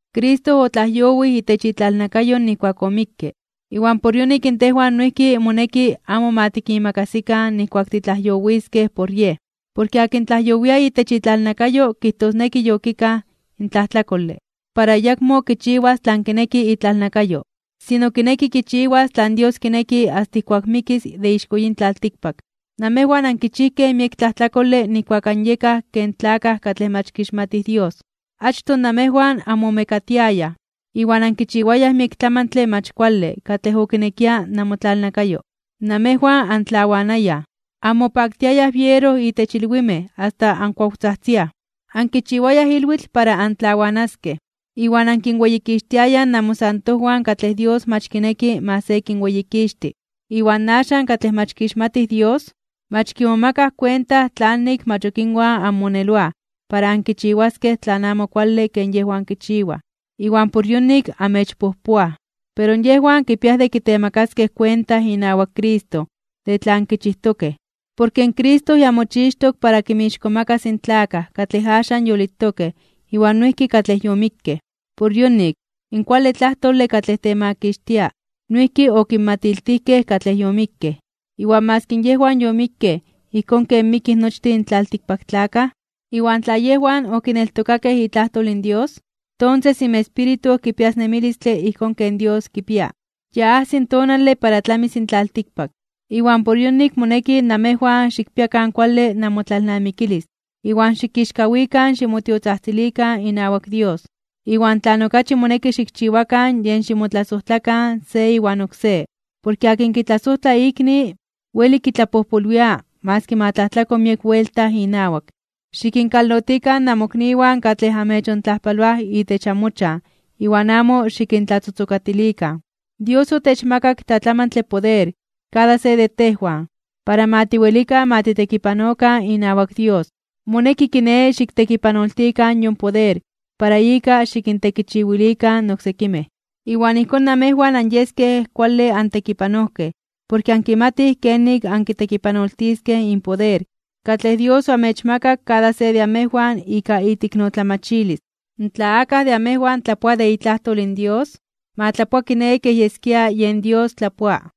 Cristo otlajyowij itech itlalnakayo nijkuak omikke, iwan por yonik in tejwan noijki moneki amo ma tikimakasikan nijkuak titlajyowiskej por Yej. Porke akin tlajyowia itech itlalnakayo kijtosneki yokikaj in tlajtlakole, para ayakmo kichiwas tlan kineki itlalnakayo. Sino kineki kichiwas tlan Dios kineki asta ijkuak mikis de ixko yin tlaltikpak. Namejwan ankichijkej miek tlajtlakole nijkuak anyekaj ken tlakaj katlej mach kixmatij Dios. Achtoj namejwan anmomekatiayaj iwan ankichiwayaj miek tlamantle mach kuale katlej okinekia namotlalnakayo. Namejwan antlawanayaj, anmopaktiayaj biero itech ilwimej asta ankuawtzajtziaj, ankichiwayaj ilwitl para antlawanaskej, iwan ankinweyikixtiayaj namosantojwan katlej Dios mach kineki ma se kinweyikixti. Iwan axan katlej mach kixmatij Dios, mach kimomakaj kuenta tlanik mach ok inwan anmoneloaj para ankichiwaskej tlan amo kuale ken yejwan kichiwaj, iwan por yonik amechpojpoaj. Pero yejwan kipia de kitemakaskej kuenta inawak Cristo de tlan kichijtokej. Porke in Cristo ya mochixtok para kinmixkomakas (kintzonmanas) in tlakaj katlej axan yolitokej iwan noijki katlej yomikkej. Por yonik, in kuale tlajtole katlej temakixtia, noijki okinmatiltijkej katlej yomikkej. Iwan maski yejwan yomikkej ijkón ken mikij nochtin tlaltikpaktlakaj, iwan tla yejwan okineltokakej itlajtol in Dios, tonses inmespíritu kipias nemilistle ijkón ken Dios kipia. Ya ajsi tonale para tlamis in tlaltikpak. Iwan por yonik moneki namejwan xikpiakan kuale namotlalnamikilis iwan xikixkawikan (ximomelikaj) ximotiotzajtzilikan inawak Dios. Iwan tlan okachi moneki xikchiwakan yen ximotlasojtlakan se iwan oksé. Porke akin kitlasojtla ikni, weli kitlapojpolwia maski ma tlajtlako miek buelta inawak. Xikinkalotikan amokniwan katlej amechontlajpaloaj itech amochan iwan amo xikintlatzotzokatilikan. Dios otechmakak tlatlamantle poder kada se de tejwan para ma tiwelikan ma titekipanokan inawak Dios. Moneki kiné xiktekipanoltikan yon poder para ika xikintekichiwilikan oksekimej. Iwan ijkón namejwan anyeskej kuale antekipanojkej porke ankimatij kenik ankitekipanoltiskej in poder katlej Dios oamechmakak kada se de amejwan ika iteiknotlamachilis. Tla akaj de amejwan tlapoa de itlajtol in Dios, ma tlapoa kiné kej yeskia yen Dios tlapoa.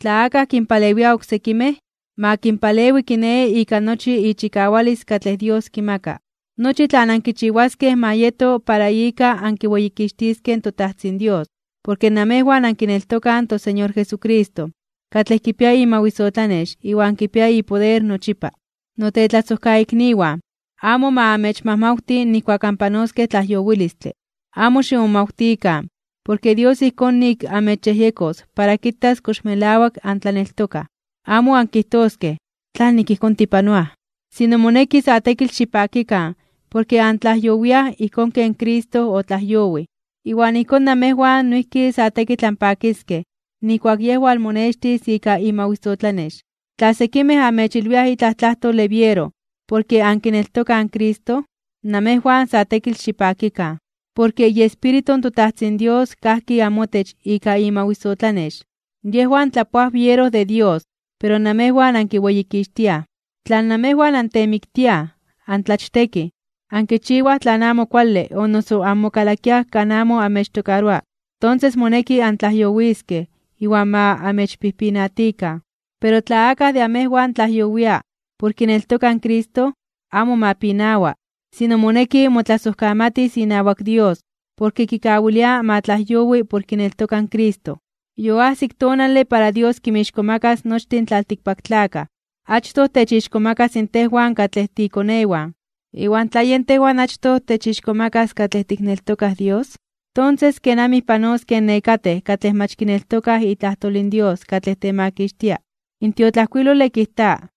Tla akaj kinpalewia oksekimej, ma kinpalewi kiné ika nochi ichikawalis katlej Dios kimaka. Nochi tlan ankichiwaskej ma yeto para ika ankiweyikixtiskej in toTajtzin Dios porke namejwan ankineltokaj in toSeñor Jesucristo, katlej kipia imawisotlanex iwan kipia ipoder nochipa. Notetlasojkaikniwan, amo ma amechmajmawti nijkuak anpanoskej tlajyowilistle. Amo ximomawtikan porke Dios ijkón nik amechyejyekos para kitas kox melawak antlaneltokaj. Amo ankijtoskej tlanik ijkón anpanoaj. Sino moneki sa tekitl xipakikan porke antlajyowiaj ijkón ken Cristo otlajyowij, iwan ijkón namejwan noijki sa tekitl anpakiskej nijkuak Yej walmonextis ika imawisotlanex. Tla sekimej amechilwiaj itlaj tlajtole biero porke ankineltokaj in Cristo, namejwan sa tekitl xipakikan. Porke iEspíritu in toTajtzin Dios kajki amotech ika imawisotlanex. Yejwan tlapoaj biero de Dios, pero namewan ankiweyikixtiaj. Tla namejwan antemiktiaj, antlachtekij, ankichiwaj tlan amo kuale o noso anmokalakiaj kan amo amechtokaroa, tonses moneki antlajyowiskej iwan ma amechpijpinatikan. Pero tla akaj de amejwan tlajyowia por kineltoka in Cristo, amo ma pinawa. Sino moneki ma motlasojkamati inawak Dios porke kikawilia ma tlajyowi por kineltoka in Cristo. Yoajsik tonale para Dios kinmixkomakas (kintzonmanas) nochtin tlaltikpaktlakaj. Achtoj techixkomakas tejwan katlej tiikonewan. Iwan tla yen tejwan achtoj techixkomakas katlej tikneltokaj Dios, tonses ¿kenamij panoskej nekatej katlej mach kineltokaj itlajtol in Dios katlej temakixtia? In tiotlajkuilole kijta: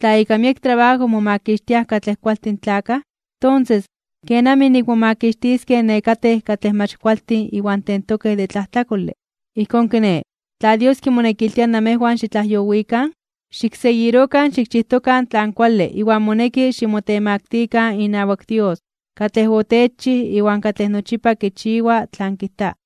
Tla ika miek trabajo momakixtiaj katlej kualtin tlakaj, tonses ¿kenamij nik momakixtiskej nekatej katlej mach kualtin iwan tentokej de tlajtlakole? Ijkón kiné, tla Dios kimonekiltia namejwan xitlajyowikan, xikseguirokan xikchijtokan tlan kuale iwan moneki ximotemaktikan (ximotemaktilikan) inawak Dios katlej otechchij iwan katlej nochipa kichiwa tlan kijta.